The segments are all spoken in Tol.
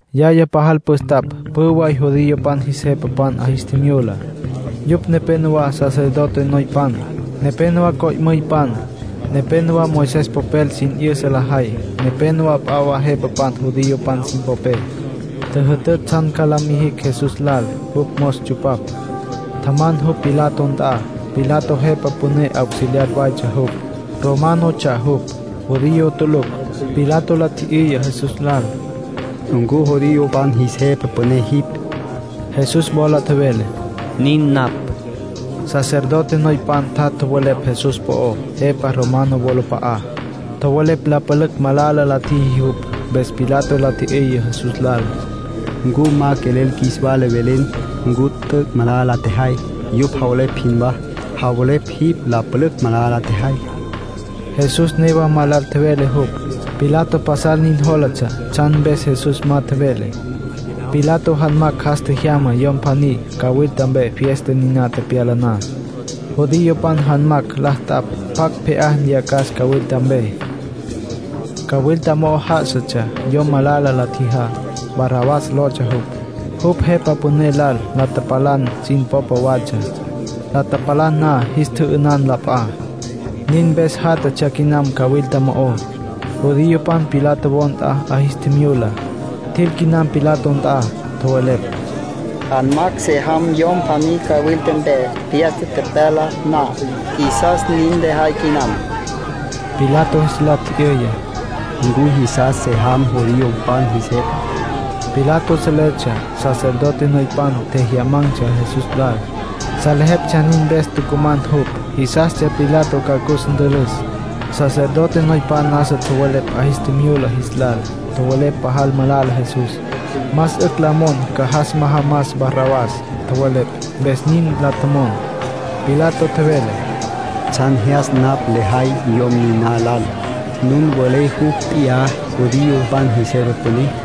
Yaya pajal püstapj pjü way judiopan jis jepapan 'a jis tjimyula, yupj nepenowá sacerdote noypan, nepénowa co'müypan, nepénowa Moisés popel sin 'yüsa lajay, nepénowa p'a wa jepapan judiopan sin popé. Tjüjütütj tsjan ca la mijicj Jesús lal. Jupj mos tsupapj. Tjaman jupj Pilato nt'a. Pilato jepa püné auxiliar waytsja jupj. Románotsja jupj, judío tulucj. Pilato la tji'yüya Jesús lal: —¿Ncu judiopan jis jepa püné jipj? Jesús wola tjevele: —Nin napj. Sacerdote noypan tjat' tjowelepj Jesús po'ó jepa romano wolap'a'á. Tjowelepj la pülücj malala la tjiji jupj. Mpes Pilato la tji'yüya Jesús lal: —¿Ncu ma quelel qjuis wala velen ncu t'üc' malala la tjejay, yupj javelepj jinwá? Javelepj jipj la pülücj malala la tjejay. Jesús newa ma lal tjevele jupj. Pilato pasal nin jólatsja tsjan mpes Jesús ma tjevele. Pilato janmacj jas tjejyama yom pjaní cawilta mpe fiesta niná tepyala na. Judiopan janmacj la t'apj pjacj pje'á nyacas cawilta mpe. Cawilta mo'o já'asatsja yom malala la tjijá, Barrabás lotsja jupj. Jupj jepa püné lal la tapalan sin popa watsja. La tapalan na, jis tjü'ünan la p'a. Nin mpes játjatsja quinam cawilta mo'ó. Judiopan Pilato wo nt'a 'a jis tjimyula, tjil quinam Pilato nt'a, tjowelepj: —Janmacj se jam yom pjaní cawilta mpe fiesta tepyala na. Qjuisas nin lejay quinam. Pilato jis la tji'yüya: —¿Ncu jisas se jam judiopan jis jepa? Pilato seletsja sacerdote noypan tjejyaman̈tsja Jesús lal. Seletsja nin mpes tucuman jupj. Jisastsja Pilato ca cus ntülüs. Sacerdote noypan nasa tjowelepj 'a jis tjimyula jis lal. Tjowelepj pajal malala Jesús. Más 'ücj la mon ca jas majamas Barrabás, tjowelepj. Mpes nin la tjomon. Pilato tjevele: —¿Tsjan jyas napj lejay yom niná lal? Nun welé jupj p'iyá judiopan jis jepa püné.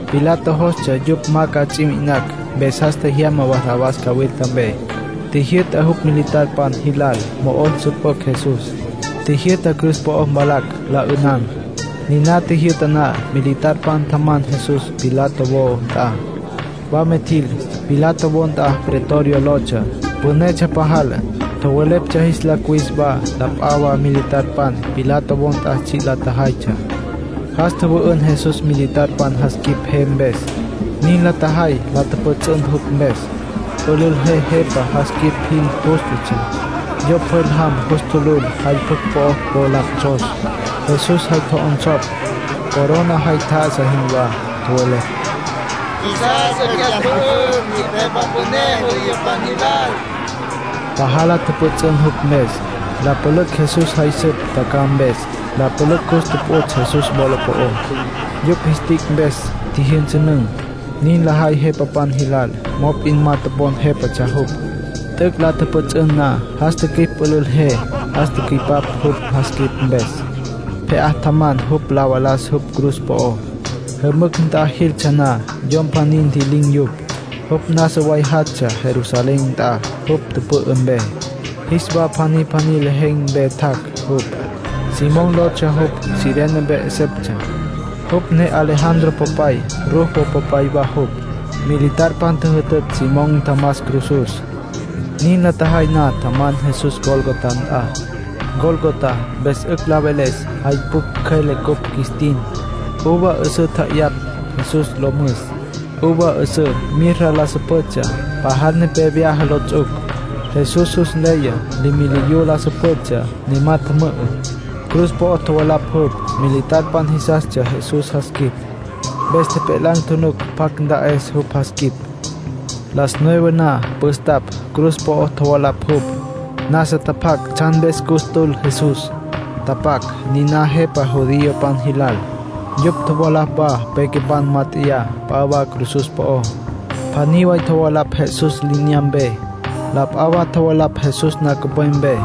Pilato jostsja yupj ma ca ts'i mi'inacj. Mpes jas tjejyama Barrabás cawilta mpe. Tjijyü'ta jupj militarpan jilal mo'o nsüpücj Jesús. Tjijyü'ta cruz po'o mvalacj, la 'ünan. Niná tjijyü'ta na, militarpan tjaman Jesús Pilato wo nt'a. Wama tjil. Pilato wo Pretorio lotsja. Pünetsja pajal. Tjowelepj jis la cuwis wa la p'a wa militarpan Pilato wo nt'a tsji' la tjajaytsja. Jas tjüwü'ün Jesús militar jas quip je mpes. Nin la tjajay la pjüts'ün jupj mpes. Pülül je jepa jas quip jin jústatsja. Yo pjwel jam jus tjulujupj jay pjucj po'o la 'onsos. Jesús jay tjo'onsopj, corona jay tjá'asatsja jinwá. Tjowelepj: —¡Qjuisas 'ücj jyas mpü'üm! ¡Jipj jepa püné judiopan jilal! Pajal la tjüpjüts'ün jupj mpes. La pülücj Jesús jay süptsja tjacjaj mpes. La pülücj cus tuputs' Jesús wola po'ó. Yupj jis tic' mpes tjijyünsünün̈. Nin lajay jepapan jilal, mop'in ma topon jépatsja jupj. T'üc' la tjüpjüts'ün na, jas tjü'ipj pülül je. Jas tücüipap jupj jas quip mpes. Pje'á tjaman jupj la valas jupj cruz po'ó. Jümücj nt'a jiltsja na, yom pjaní ntji'lin̈ yupj. Jupj nasa way jactsja Jerusalén nt'a jupj tüpü'ü mpe. Jis wa pjaní pjaní lejen̈ mpe tjac' jupj. Simón lotsja jupj. Cirene mpe 'eseptsja. Jupj ne Alejandro popay, Rufo popay wa jupj. Militarpan tjüjütütj Simón ntjamas cruzus. Nin la tjajay na, tjaman Jesús Gólgota nt'a. “Gólgota” mpes 'ücj la veles “Jay Pjucj Cjüele” cupj qjuis tin. Uva 'üsǘ tja'ayapj Jesús lo müs. Uva 'üsǘ mirra la süpjütsja, pajal nepé vyaja lo ts'uc. Jesús jus nleya leméliyu la süpjütsja, ne ma tjümü'ü. Cruz po'o tjovalapj jupj. Militarpan jisastsja Jesús jas quip. Mpes tjepjelan̈ tjunuc pjacj nta'es jupj jas quip. Las nueve na, püstapj, cruz po'o tjovalapj jupj. Nasa tapac tsjan mpes cus tül Jesús. Tapac: NINÁ JEPA JUDIOPAN JILAL. Yupj tjovalapj wa pequepan mát'eya p'a wa cruzus po'ó. Pjaní way tjovalapj Jesús li'inyampe. La p'a wa tjovalapj Jesús nancupwepe.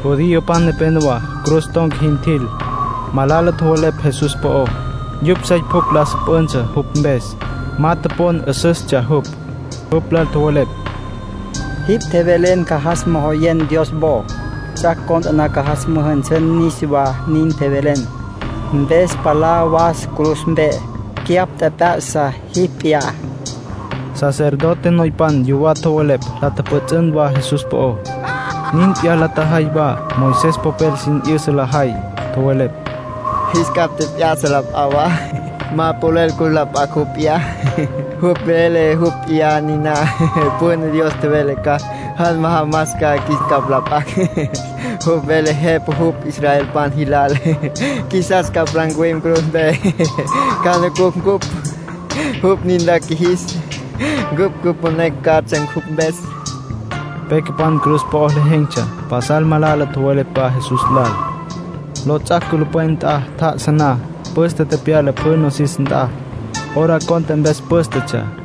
Judiopan nepénowa cruz ton̈ca jin tjil. Malala tjowelepj Jesús po'ó. Yupj sey pjucj la süpjüntsja jupj mpes. Ma topon 'üsüstsja jupj. Jupj lal tjowelepj: —Jipj tjevelen ca jas mojoyen Dios wo. Ts'ac' cont'e na ca jas müjünsün niswá, nin tjevelen. Mpes, ¡palá was cruz mpe! ¡Cyapj tjep'ya'sa jipj p'iyá! Sacerdote noypan yuwá tjowelepj. La tjüpjüts'ün wa Jesús po'ó. Nin p'iyá la tjajay wa Moisés popel sin 'yüsa lajay. Tjowelepj: —Jis capj tjep'ya'sa la p'a wa. Ma polel cus la p'acj jupj p'iyá. Jupj vele jupj p'iyá niná Jepa Püné Dios tjevele ca jas majamas qjuis capj la p'acj. Jupj vele Jepa jupj israelpan jilal. Qjuisas palá ncuwim cruz mpe, ca nucucj ncupj. Jupj nin la qjuijis, cupj cüponecj catsja jupj mpes —nin tjowelepj. Pequepan cruz po'o lejen̈tsja pasal malala tjowelepj wa Jesús lal. Lots'ac' culupwen nt'a tjá'asa na, püste tepyala pjü nosis nt'a. Hora cont'e mpes pǘstetsja.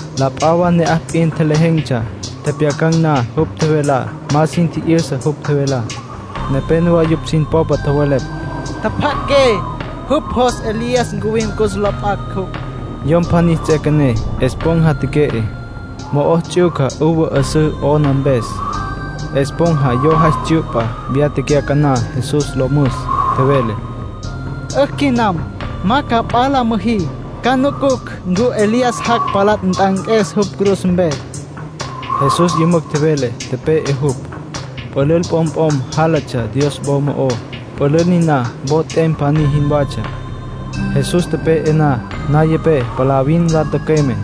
La p'a wa ne'aj p'in tjelejen̈tsja. Tjepjyacan̈ na jupj tjevelá, ma sin tji'yüsa jupj tjevelá. Nepénowa yupj sin popa tjowelepj: —Tjapja'aqué. Jupj jos Elías ncuwim cus la p'acj jupj. Yom pjaní ts'üequené, esponja teque'e. Mo'o ts'yuca uva 'üsǘ 'ona mpes. Esponja yo jay tsyu'pa, viyá tecyacaná Jesús lo müs. Tjevele: —'Ücj quinam. Ma ca p'a la müjí. Ca nucucj ncu Elías jac' palá nt'anques jupj cruz mpe. Jesús yümücj tjevele, tepe'e jupj. Pülül p'omp'om jálatsja Dios wo mo'ó, pülül niná wo t'em pjaní jinwatsja. Jesús tepe'e na, nayapé palavin la tücüeme.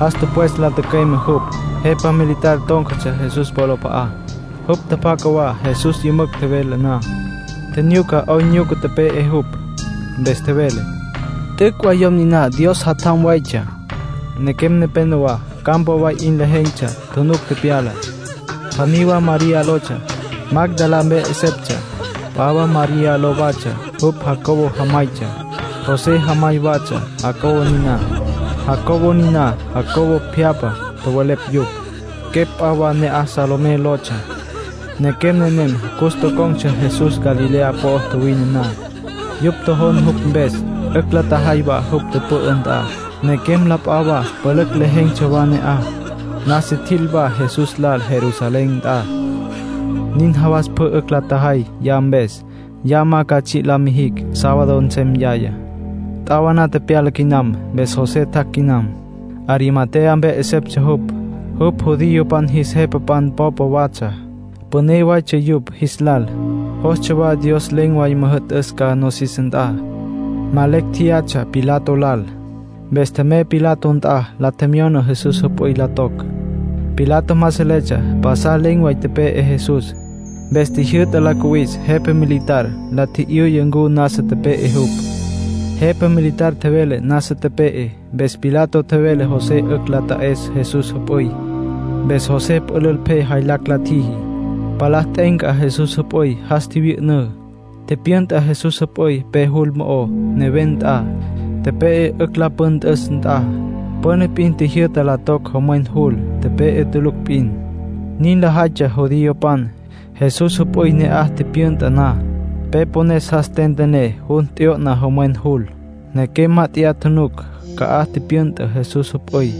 Jas tüpwes la tücüeme jupj. Jepa militar tón̈catsja Jesús wolap'a'á. Jupj tjapjaca wa Jesús yümücj tjevele na. Tjinyuca 'oyn nyuca tepe'e jupj. Mpes tjevele: —T'üc' way yom niná Dios Jatjam waytsja. Nequem nepénowa campa way 'in lejen̈tsja, tjunuc tepyalá. Pjaní wa María lotsja, Magdalá mpe 'eseptsja. P'a wa María ló watsja. Jupj Jacobo jamaytsja, José jamay watsja. Jacobo niná “Jacobo pjyapja” tjowelepj yupj. Quepj p'a wa ne'aj Salomé lotsja. Nequem nenem cus tocon̈tsja Jesús Galilea po'o tjuwine na. Yupj tjojon jupj mpes, 'ücj la tjajay wa jupj tüpü'ü nt'a. Nequem la p'a wa pülücj lejen̈tsja wa ne'aj. Nasa tjiquil wa Jesús lal Jerusalén nt'a. Nin jawas pjü 'ücj la tjajay ya mpes, ya ma ca tsji' la mijicj. Sábado nsem yayá. T'awaná tepyala quinam, mpes José tjac' quinam. Arimatea mpe 'eseptsja jupj. Jupj judiopan jis jepapan popa watsja. Püné waytsja yupj jis lal. Jostsja wa Dios len̈ way müjü'tüs ca nosis nt'a. Ma lecj tjeyatsja Pilato lal. Mpes tjemey Pilato nt'a, la tjemyona Jesús jüp'üy la toc. Pilato ma seletsja pasal len̈ way tepe'e Jesús. Mpes tjijyü'ta la cuwis jepa militar. La tji'yüya ncu nasa tepe'e jupj. Jepa militar tjevele nasa tepe'e. Mpes Pilato tjevele José 'ücj la ta'es Jesús jüp'üy. Mpes José pülül pje jaylacj la tjiji. Palá t'e'enca Jesús jüp'üy, jas tjivyü'ünǘ. Tipyünta Jesús jüp'üy pe jul mo'ó, neven nt'a, tepe'e 'ücj la püntüs nt'a. Püna p'in tjijyü'ta la toc jomwen jul, tepe'e tulucj p'in. Nin lajaytsja judiopan. Jesús jüp'üy ne'aj tipyünta na, pe pones jas tentené, jun t'yo'na jomwen jul. Nequem mát'eya tjunuc ca'aj tipyünta Jesús jüp'üy.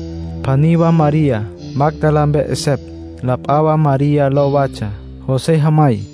Pjaní wa María, Magdalá mpe 'esepj. La p'a wa María ló watsja, José jamay.